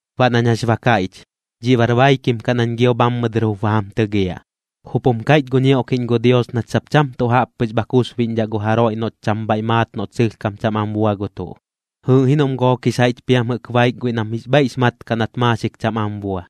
Baꞌ nañ jax ba kaiꞌch, dhiꞌ bar baikim kaꞌ nañ gio bhammɨ dɨr jup ba jam tɨgiaꞌ. Jup jum kaiꞌch gu ñioꞌkiꞌñ gu Dios nach sap cham tuꞌ jaꞌp pɨx bha kusbiꞌñdhaꞌ gu jaroiꞌ noꞌch cham bhaiꞌ maat noꞌt sɨlhkam cham am bua gu tuꞌ, jɨɨꞌ ji noꞌm gook jix jaiꞌch piam jɨꞌk baik guiꞌ nam jix bhaiꞌx maat kaꞌ nat maaxik cham am bua,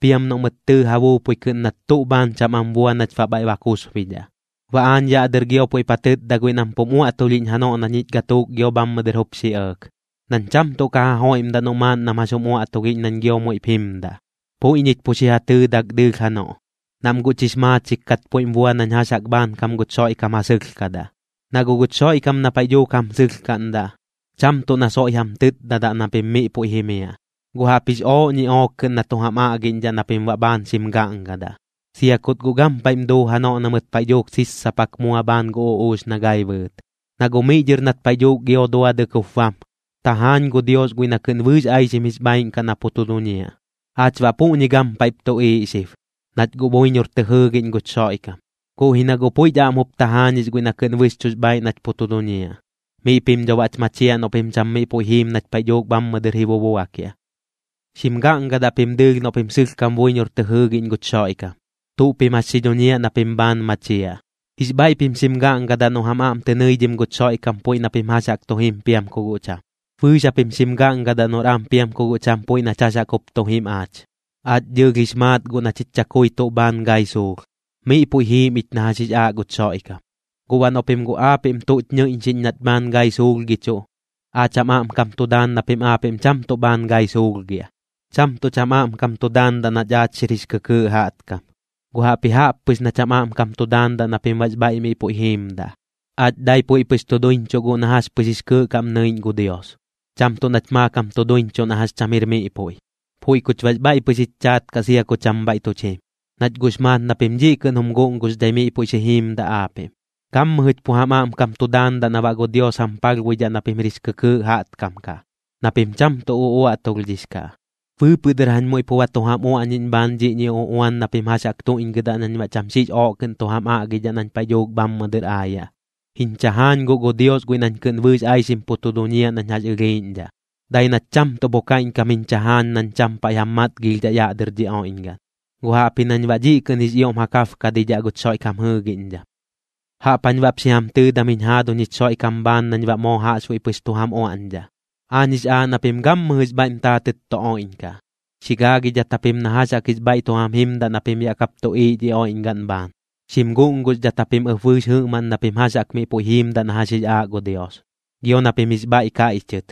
piam noꞌ mɨt tɨɨ ja buupui kɨꞌn nat tuꞌ bhaan cham am bua nach baꞌ bhaiꞌ ba kusbidhaꞌ. Baꞌ aañ yaꞌ dɨr gio puiꞌp ja tɨtda guiꞌ nam pum uaꞌtulhiꞌñ janoꞌ na ñich gatuuk gio bhammɨ dɨr jup xi ɇɇk, nañ cham tuꞌ ka ja joiꞌmdaꞌ noꞌ maaꞌn nam jax jum uaꞌtulhiꞌñ nañ gio muiꞌp jimdaꞌ, puiꞌ ñich pu xi ja tɨɨdak dɨɨlh janoꞌ, nam guꞌ chix maachik kat puiꞌm bua nañ jax jaꞌk bhaankam guch Xoiꞌkam ja sɨlhkadaꞌ. Na guꞌ guch Xoiꞌkam na paiꞌ dhuuk jam sɨlhkaꞌndaꞌ, cham tuꞌ na soiꞌ jam tɨtdadaꞌ na pim miꞌ puiꞌ jimiaꞌ, guꞌ jaꞌpjix ooꞌ ñiꞌook kɨꞌn na tu jam aꞌgiꞌñdhaꞌ na pim baꞌ bhaan xim gaꞌngadaꞌ, sia kut guꞌ gampaiꞌm duu janoꞌ na mɨt paiꞌ dhuuk sissapak mua bhaan gu uꞌuux na gai bɨɨt. Na guꞌ miꞌ dhɨr nat paiꞌ dhuuk gio duadɨk jup bam, tajaañ gu Dios guiꞌ na kɨꞌn bɨɨx aixim jix bhaaiꞌn kaꞌ na pu tu duñiaꞌ. Aach baꞌ puꞌñi gampaiꞌp tuꞌiiꞌ xib, nach guꞌ buiñor tɨ jɨɨgiꞌñ guch Xoiꞌkam, guꞌ ji na guꞌ puiꞌch aꞌm jup tajaañix guiꞌ na kɨꞌn bɨxchuꞌx bhaaiꞌ nach pu tu duñiaꞌ. Miꞌ pim dho baꞌch machiaꞌ noꞌ pim cham miꞌ puiꞌ jiim nach paiꞌ dhuuk bhammɨ dɨr ji bubuakiaꞌ. Xim gaꞌngadaꞌ pim dɨɨlh noꞌ pim sɨlhkam buiñor tɨ jɨɨgiꞌñ guch Xoiꞌkam, tuꞌ pim jax xi dhuñiaꞌ na pim bhaan machiaꞌ. Jix bhaiꞌ pim xim gaꞌngadaꞌ noꞌ jam aꞌm tɨ nɨidhim guch Xoiꞌkam puiꞌ na pim jax jaꞌk tu jim piam ku guꞌ cham. Bɨɨx japim xim gaꞌngadaꞌ noꞌr am piam ku guꞌ cham puiꞌ nach jax jaꞌk jup tu jim aach. Aach dɨɨlh jix maat guꞌ na chich chakui tuꞌ bhaan gai suulh, miꞌ puiꞌ pu jiim ich na jax jix aaꞌ guch Xoiꞌkam. Guꞌ baꞌ noꞌ pim guꞌ aapiꞌm tuꞌch ñɨiꞌñxiꞌñ nach bhaan gai suulhgichuꞌ, aach jam aꞌmkam tu daan na pim aapiꞌm cham tuꞌ bhaan gai suulhgiaꞌ. Cham tuꞌch jam aꞌmkam tu daandaꞌ nach aach xiꞌr jix kɨkɨɨꞌ jaꞌtkam, guꞌ jaꞌpji jaꞌp pɨx nach jam aꞌmkam tu daandaꞌ na pim baꞌx bhaiꞌ miꞌ puiꞌ jiimdaꞌ. Aach dai puiꞌ pɨx tu duiñchuꞌ guꞌ na jax pɨx jix kɨɨꞌ kaꞌm nɨiꞌñ gu Dios, cham tuꞌ nach maakam tu duiñchuꞌ na jax cham jir miꞌ puiꞌ. Puiꞌ kuch baꞌx bhaiꞌ pɨx jich chaat kaꞌ sia ku cham bhaiꞌ tuch jim, nach guꞌx maat na pim dhiꞌ kɨꞌn jum guꞌnguxdhai miꞌ puiꞌ xi jiimdaꞌ aapiꞌm. Gammɨjɨch pu jam aꞌmkam tu daandaꞌ na baꞌ gu Dios jam palhbuidhaꞌ na pim jir jix kɨkɨɨꞌ jaꞌtkam kaꞌ, na pim cham tuꞌ uꞌuaꞌtulhdhix kaꞌ. Bɨɨpɨꞌ dɨr jañ muiꞌ pu ba tu jam uaꞌñiꞌñ bhaan dhiꞌñi uꞌuan na pim jax jaꞌk tuiꞌñgɨdaꞌ nañ baꞌ cham xiꞌx ooꞌ kɨꞌn tu jam aꞌgidhaꞌ nañ paiꞌ dhuuk bhammɨ dɨr aayaꞌ. Jiñ chajaañ guꞌ gu Dios guiꞌ nañ kɨꞌn bɨɨx aixim pu tu duñiaꞌ nañ jax ɨlhiiꞌñdhaꞌ, dai nat cham tuꞌ pu kaiꞌñkam jiñ chajaañ nañ cham paiꞌ jam matgilhdhaꞌ yaꞌ dɨr dhi oiꞌñgaꞌn, guꞌ jaꞌpji nañ baꞌ dhiꞌ kɨꞌn jix ioꞌm ja kabkadidhaꞌ guch Xoiꞌkam jɨɨgiꞌñdham. Jaꞌp jañ baꞌp xi jam tɨɨdam jiñ jaaduñ jich Xoiꞌkam bhaan nañ baꞌ moo jaꞌxbuiꞌ pɨx tu jam uaꞌñdhaꞌ: Aañ jix aaꞌ na pim gammɨjɨx bhaiꞌm taatɨt tu oiꞌñkaꞌ. Xi gaagidhat japim na jax jaꞌk jix bhaiꞌ tu jam jimdaꞌ na pim yaꞌ kap tuꞌiiꞌ dhi oiꞌñgaꞌn bhaan. Xim guꞌnguxdhat japim ɨp bɨɨx jɨꞌmaꞌn na pim jax jaꞌk miꞌ puiꞌ jiimdaꞌ na jax jix aaꞌ gu Dios. Gio na pim jix bhaiꞌ kaiꞌchɨt,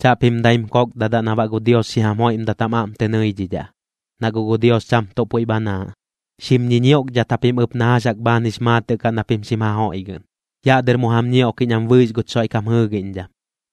chaꞌpim daim kokdadaꞌ na baꞌ gu Dios xi jam joiꞌmdat jam aꞌm tɨ nɨiꞌñdhaꞌ, na guꞌ gu Dios cham tuꞌ puiꞌ bhanaaꞌ. Xim ñiñioꞌkdhat japim ɨp na jax jaꞌk bhaan jix maatɨꞌ kaꞌ na pim xim ja joiꞌgɨꞌn. Yaꞌ dɨr mu jam ñioꞌkiꞌñ am bɨɨx guch Xoiꞌkam jɨɨgiꞌñdham.